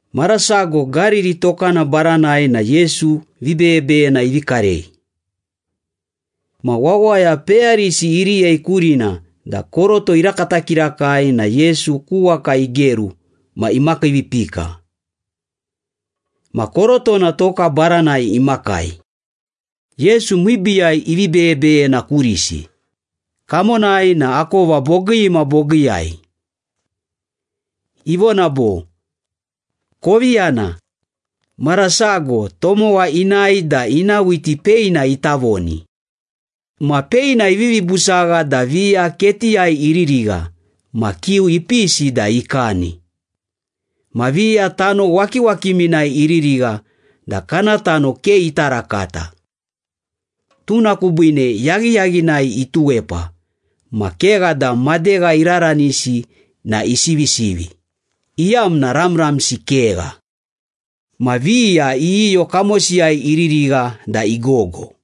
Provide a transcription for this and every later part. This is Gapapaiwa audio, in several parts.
Mara sago Gariri tokana baranai na Yesu vibeyebeyena ivi karei. Ma wawaya peyarisi iriyei kurina da koroto irakata kirakai na Yesu ku waka igeru ma imakiivipika. Ma korotona toka baranai imakai. Yesu miibiiyai ivi beyebeyena kurisi, kamonai na akova bogii ma bogiiyai. Ivona bo, “Kovi yana. Mara sago, tomowa inae da ina whiti peina ita voni. Ma peina ivivi busagha da viya ketiyai iririgha ma kiu ipisi da ikani. Ma viya tano wakiwakiminai iririgha da kana tano ke ita rakata. Tuna kubiine yaghiyaghinai ituwepa ma kegha da madegha iraranisi na isivisivi, iyamna ramramsi kegha. Ma viya iyiyo kamosiyai iririgha da igogo.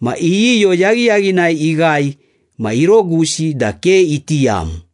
Ma iyiyo yaghiyaghinai ighae ma irogusi da ke iti yam.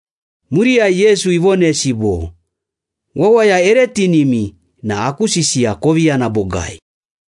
Muriyai Yesu ivonesi bo, “Wawaya ere tinimi na aku sisiya kovi yana bogai.”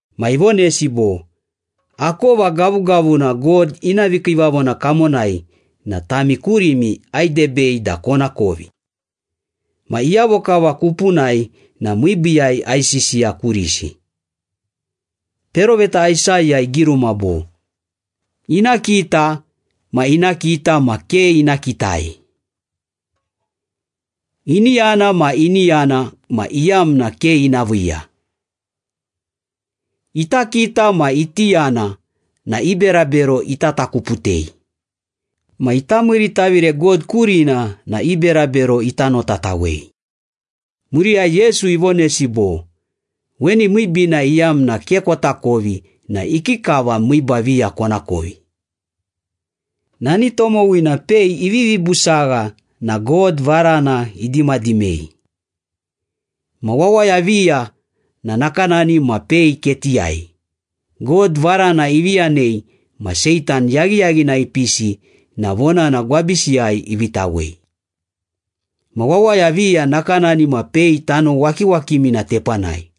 Ma ivonesi bo, “Akova gavugavuna God ina vikiivavona kamonai na tami kurimi aidebei da konakovi. Ma iyavo kava kupunai na miibiiyai aisisiya kurisi. Peroveta Aisaya igiruma bo, ‘Ina kita ma ina kita ma ke ina kitai. Ini yana ma ini yana ma iyamna ke ina viiya. Ita kita ma iti yana na i berabero ita takuputei ma ita miiritavire God kurina na i berabero ita notatawei.’” Muriyai Yesu ivonesi bo, “Weni miibiina iyamna ke kotakovi na ikikava miiba viya konakovi? Nani tomowina pei ivivi busagha na God varana idimadimei. Ma wawaya viya na nakanani ma pei ketiyai. God varana ivi yanei ma Seitan yaghiyaghinai ipisi na vonana gwabisiyai iviitawei. Ma wawaya viya nakanani ma pei tano wakiwakimina tepanai.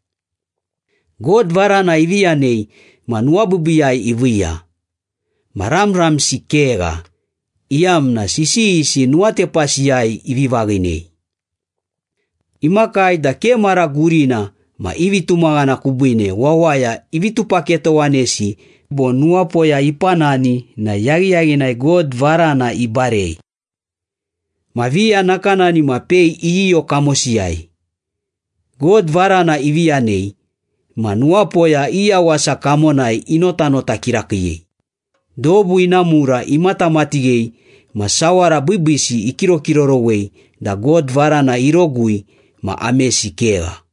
God varana ivi yanei ma nuwabiibiiyai iviiya. Ma ramramsi kegha, iyamna sisiyisi nuwatepasiyai ivi vaghinei. Imakai da ke mara gurina ma i vitumaghana kubiine wawaya ivi tupaketowanesi bo nuwapoya ipanani na yaghiyaghinai God varana ibarei. Ma viya nakanani ma pei iyiyo kamosiyai. God varana ivi yanei ma nuwapoya i yawasa kamonai inotanota kirakiiyei, dobu ina mura imatamatighei ma sawara biibiisi ikirokirorowei da God varana irogui ma amesi kegha.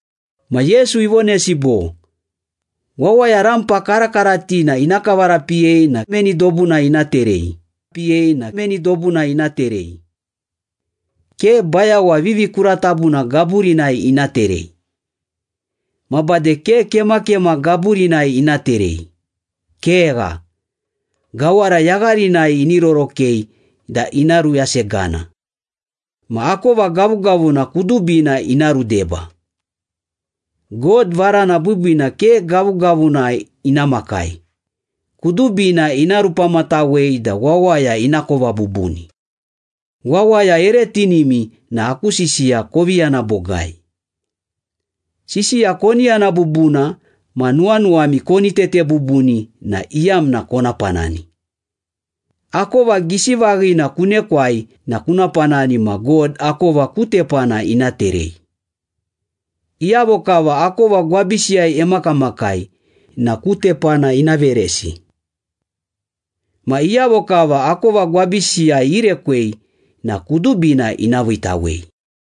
Ma Yesu ivonesi bo, “Wawaya rampa karakaratina ina kavarapiyei na meni dobunai ina terei? Ke bayawa vivikuratabuna gaburinai ina terei. Ma bade ke kemakema gaburinai ina terei. Kegha, gawara yagharinai ini rorokei da ina ruyasegana. Ma akova gavugavuna kudubina ina rudeba. God varana biibiina ke gavugavuna ina makai, kudubina ina rupamatawei da wawaya inakova bubuni. Wawaya ere tinimi na aku sisiya kovi yana bogai.” “Sisiya koni yana bubuna ma nuwanuwami koni tete bubuni na iyamna kona panani. Akova gisi vaghina kunekwai na kuna panani ma God akova ku tepana ina terei. Iyavo kava akova gwabisiyai emakamakai na ku tepana ina veresi. Ma iyavo kava akova gwabisiyai irekwei na kudubina ina viitawei.”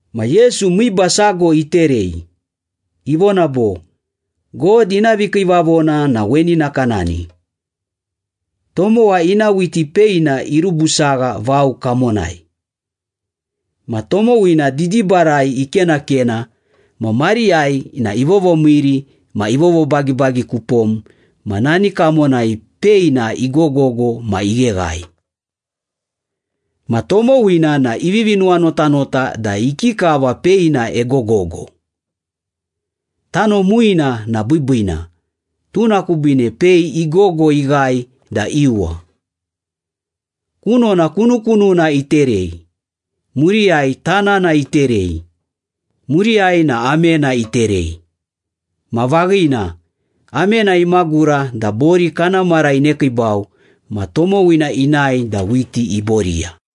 Ma Yesu miiba sago iterei, ivona bo, “God ina vikiivavona na weni nakanani. Tomowa ina whiti peina irubusagha vao kamonai. Ma tomowina didibarai ikenakena ma mariyai na ivovomiiri ma ivovobagibagi kupom ma nani kamonai peina igogogo ma igheghae. Ma tomowina na ivivi nuwanotanota da ikikava pei na egogogo. Tano muina na biibiina, tuna kubiine pei igogo ighae da iuwa. Kunona kunukununa iterei, muriyai tanana iterei, muriyai na amena iterei. Ma vaghina, amena imagura da bori kana mara inekiibau ma tomowina inae da whiti iboriya.”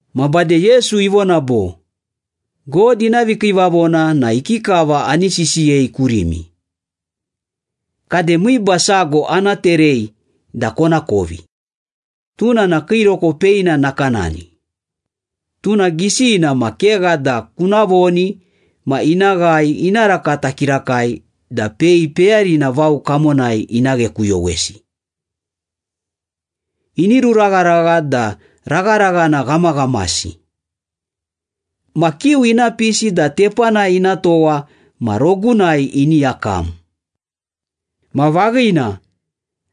Ma bade Yesu ivona bo, “God ina vikiivavona na ikikava ani sisiyei kurimi? Kade miiba sago ana terei da konakovi. Tuna na kiiroko peina nakanani. Tuna gisina ma kegha da kuna voni ma ina ghae ina rakata kirakai da pei peyarina vao kamonai ina ghekuyowesi. Ini ruragharagha da ragharaghana ghamaghamasi. Ma kiu ina pisi da tepanai ina towa ma rogunai ini yakam.” Ma vaghina,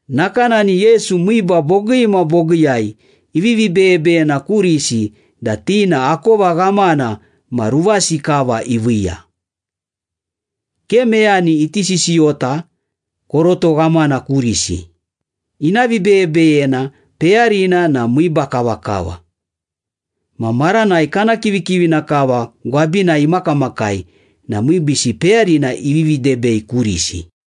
nakanani Yesu miiba bogii ma bogiiyai ivivi beyebeyena kurisi da ti na akova ghamana ma ruvasi kava iviiya. Ke meyani iti sisiyota koroto ghamana kurisi, ina vibeyebeyena peyarina na miiba kavakava. Ma maranai kana kivikivina kava gwabinai imakamakai na miibiisi peyarina ivivi debei kurisi.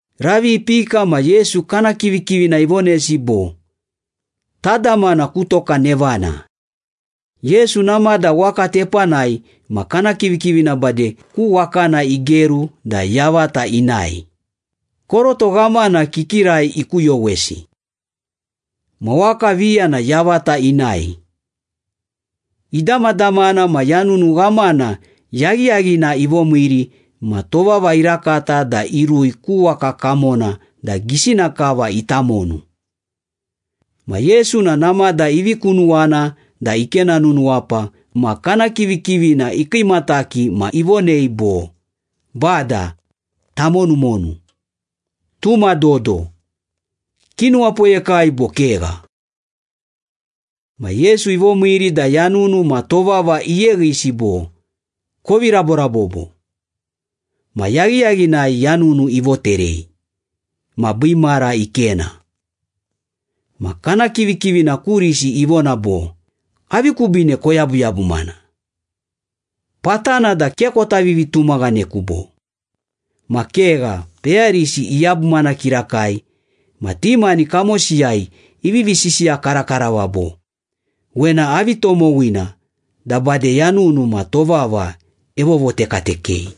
Ravi ipika ma Yesu kana kivikivina ivonesi bo, “Tadamana ku toka nevana.” Yesu namada waka tepanai ma kana kivikivina bade ku wakana igeru da yavata inae, koroto ghamana kikirai ikuyowesi. Ma waka viya na yavata inae. Idamadamana ma yanunu ghamana yaghiyaghina ivomiiri ma tovava irakata da irui ku waka kamona da gisina kava ita monu. Ma Yesu na namada ivi kunuwana da ikena nunuwapa ma kana kivikivina ikiimataki ma ivonei bo, “Bada, tamonumonu! Tuma dodo! Kinuwapoyekai bo kegha?” Ma Yesu ivomiiri da yanunu ma tovava iyeghisi bo, “Kovi raborabobo!” Ma yaghiyaghinai yanunu ivoterei. Ma biimara ikena. Ma kana kivikivina kurisi ivona bo, “Avi kubiine koyabuyabumana? Patana da ke kota vivitumaghaneku, bo?” Ma kegha, peyarisi iyabumana kirakai ma ti mani kamosiyai ivivi sisiya karakarava bo, “Wena avi tomowina da bade yanunu ma tovava evovotekatekei!”